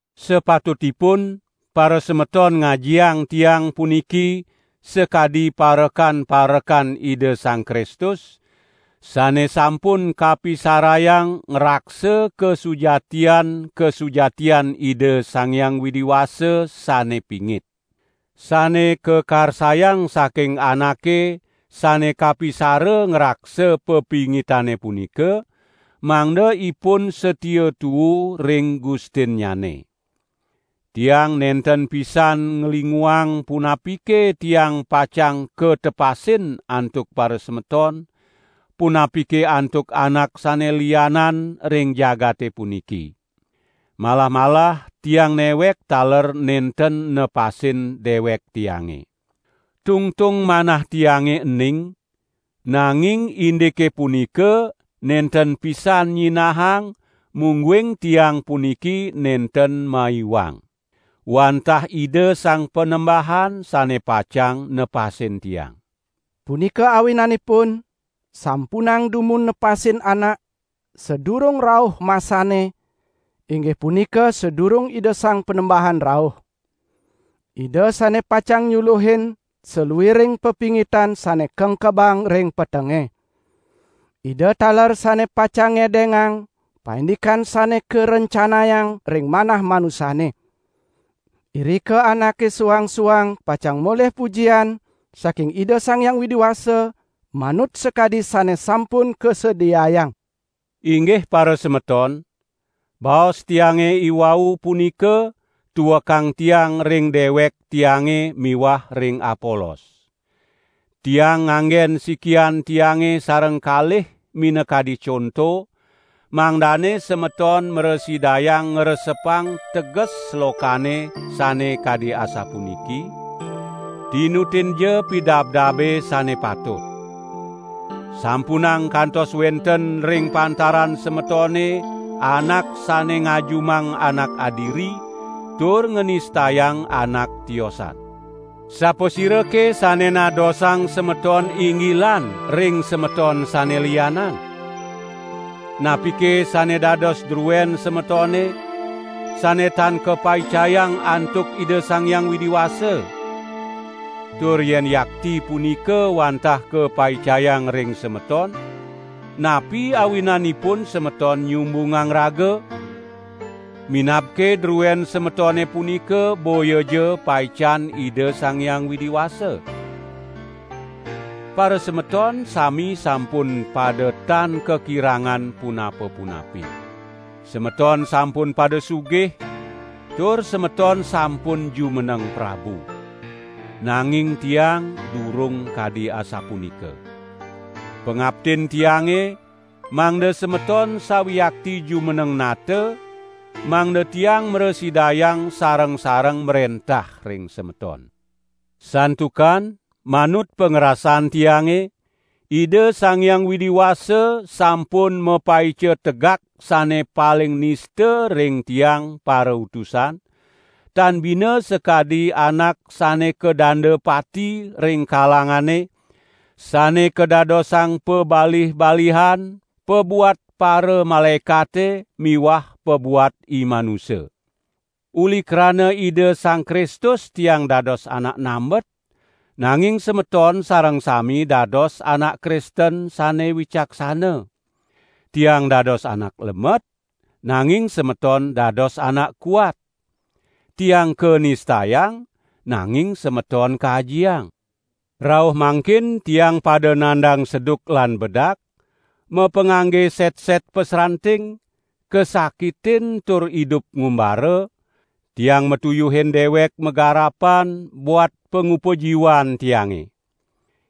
Sapatutipun parasemeton ngajiang tiang puniki sakadi parekan-parekan Ida Sang Kristus, sane sampun kapisarayang ngraksa kasujatian-kasujatian Ida Sang Hyang Widi Wasa sane pingit. Sane kakarsayang saking anake sane kapisara ngraksa pepingitane punika, mangda ipun satia tuu ring gustinnyane. Tiang nenten pisan nglinguang punapike tiang pacang katepasin antuk parasemeton, punapike antuk anak sane lianan ring jagate puniki. Malah-malah tiang newek taler nenten nepasin dewek tiange. Tungtung manah tiange ening, nanging indike punika nenten pisan nyinahang mungguing tiang puniki nenten maiwang. Wantah Ida Sang Panembahan sane pacang nepasin tiang. Punika awinanipun sampunang dumun nepasin anak sadurung rauh masane, inggih punika sadurung Ida Sang Panembahan rauh. Ida sane pacang nyuluhin saluiring pepingitan sane kengkebang ring petenge. Ida taler sane pacang ngedengang paindikan sane karencanayang ring manah manusane. Irika anake suang-suang pacang molih pujian saking Ida Sang Hyang Widi Wasa manut sakadi sane sampun kasediayang. Inggah parasemeton, baos tiange iwau punika tuekang tiang ring dewek tiange miwah ring Apolos. Tiang nganggen sikian tiange sareng kalih minakadi conto, mangdane semeton mrasidayang ngresepang teges slokane sane kadi asapuniki: "Tinutinja pidabdabe sane patut." Sampunang kantos wenten ring pantaran semetone anak sane ngajumang anak adiri, tur nganistayang anak tiosan. Sapasirake sane nadosang semeton inggilan ring semeton sane lianan? Napike sane dados druen semetone, sane tan kapaicayang antuk Ida Sang Hyang Widi Wasa? Tur yen yakti punika wantah kapaicayang ring semeton, napi awinanipun semeton nyumbungang raga, minabke druen semetone punika boyaja paican Ida Sang Hyang Widi Wasa? Parasemeton sami sampun pada tan kakirangan punapa-punapi. Semeton sampun pada sugih, tur semeton sampun jumeneng prabu. Nanging tiang durung kadi asapunika. Pangaptin tiange mangda semeton sawiakti jumeneng nata, mangda tiang mrasidayang sareng-sareng mrentah ring semeton. Santukan manut pangrasan tiange, Ida Sang Hyang Widi Wasa sampun mapaica tegak sane paling nista ring tiang parautusan, tan bina sakadi anak sane kadanda pati ring kalangane, sane kadadosang pabalih-balihan pabuat paramalaekate miwah pabuat imanusa. Uli krana Ida Sang Kristus tiang dados anak nambet, nanging semeton sareng sami dados anak Kristen sane wicaksana. Tiang dados anak lemet, nanging semeton dados anak kuat. Tiang kanistayang, nanging semeton kajiang! Rauh mangkin tiang pada nandang seduk lan bedak, mapangangge setset pasranting, kasakitin tur idup ngumbara, tiang matuyuhin dewek magarapan buat pangupa jiwan tiange.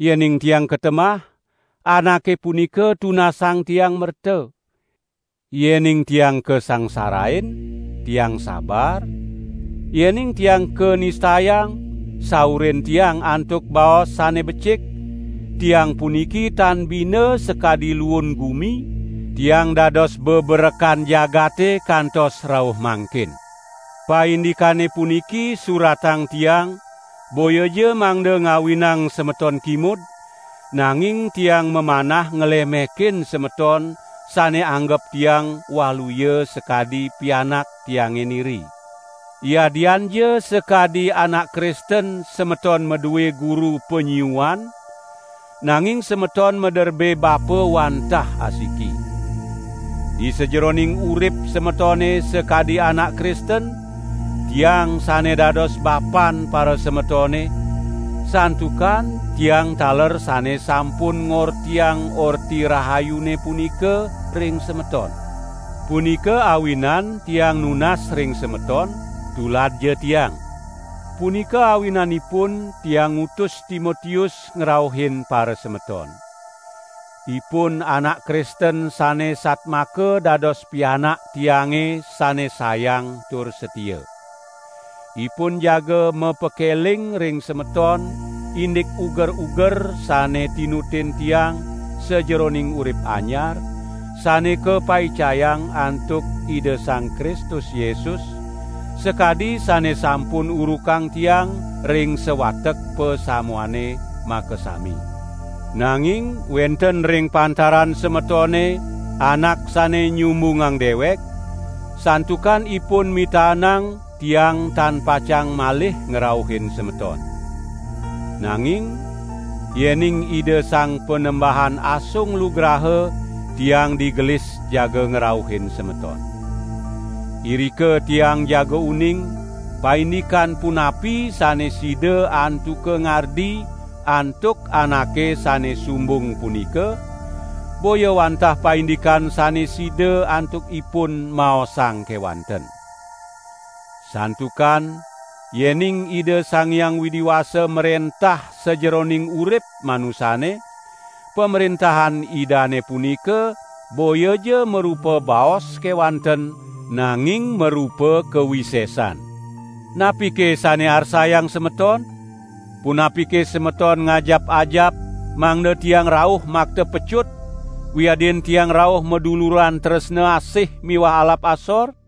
Yening tiang katemah, anake punika tunasang tiang merta; yening tiang kasangsarain, tiang sabar; yening tiang kanistayang, saurin tiang antuk baos sane becik; tiang puniki tan bina sakadi luun gumi, tiang dados beberekan jagate kantos rauh mangkin. Paindikane puniki suratang tiang boyaja mangda ngawinang semeton kimud, nanging tiang mamanah nglemekin semeton sane anggep tiang waluya sakadi pianak tiange niri. Yadianja sakadi anak Kristen semeton madue guru panyiuan, nanging semeton maderbe bapa wantah asiki. Disajeroning urip semetone sakadi anak Kristen, tiang sane dados bapan parasemetone, santukan tiang taler sane sampun ngortiang Orti Rahayune punika ring semeton. Punika awinan tiang nunas ring semeton, tuladja tiang! Punika awinanipun tiang ngutus Timotius ngrauhin parasemeton. Ipun anak Kristen sane satmaka dados pianak tiange sane sayang tur satia. Ipun jaga mapakeling ring semeton indik uger-uger sane tinutin tiang sajeroning urip anyar, sane kapaicayang antuk Ida Sang Kristus Yesus, sakadi sane sampun urukang tiang ring sawatek pasamuane makasami. Nanging wenten ring pantaran semetone anak sane nyumbungang dewek, santukan ipun mitaenang tiang tan pacang malih ngrauhin semeton. Nanging yening Ida Sang Panembahan asung lugraha, tiang digelis jaga ngrauhin semeton. Irika tiang jaga uning, paindikan punapi sane sida antuka ngardi antuk anake sane sumbung punika, boya wantah paindikan sane sida antuk ipun maosang kewanten. Santukan yening Ida Sang Hyang Widi Wasa mrentah sajeroning urip manusane, pamrentahan Idane punika boyaja marupa baos kewanten nanging marupa kawisesan. Napike sane arsayang semeton? Punapike semeton ngajap-ajap mangda tiang rauh makta pecut, wiadin tiang rauh maduluran tresna asih miwah alap asor?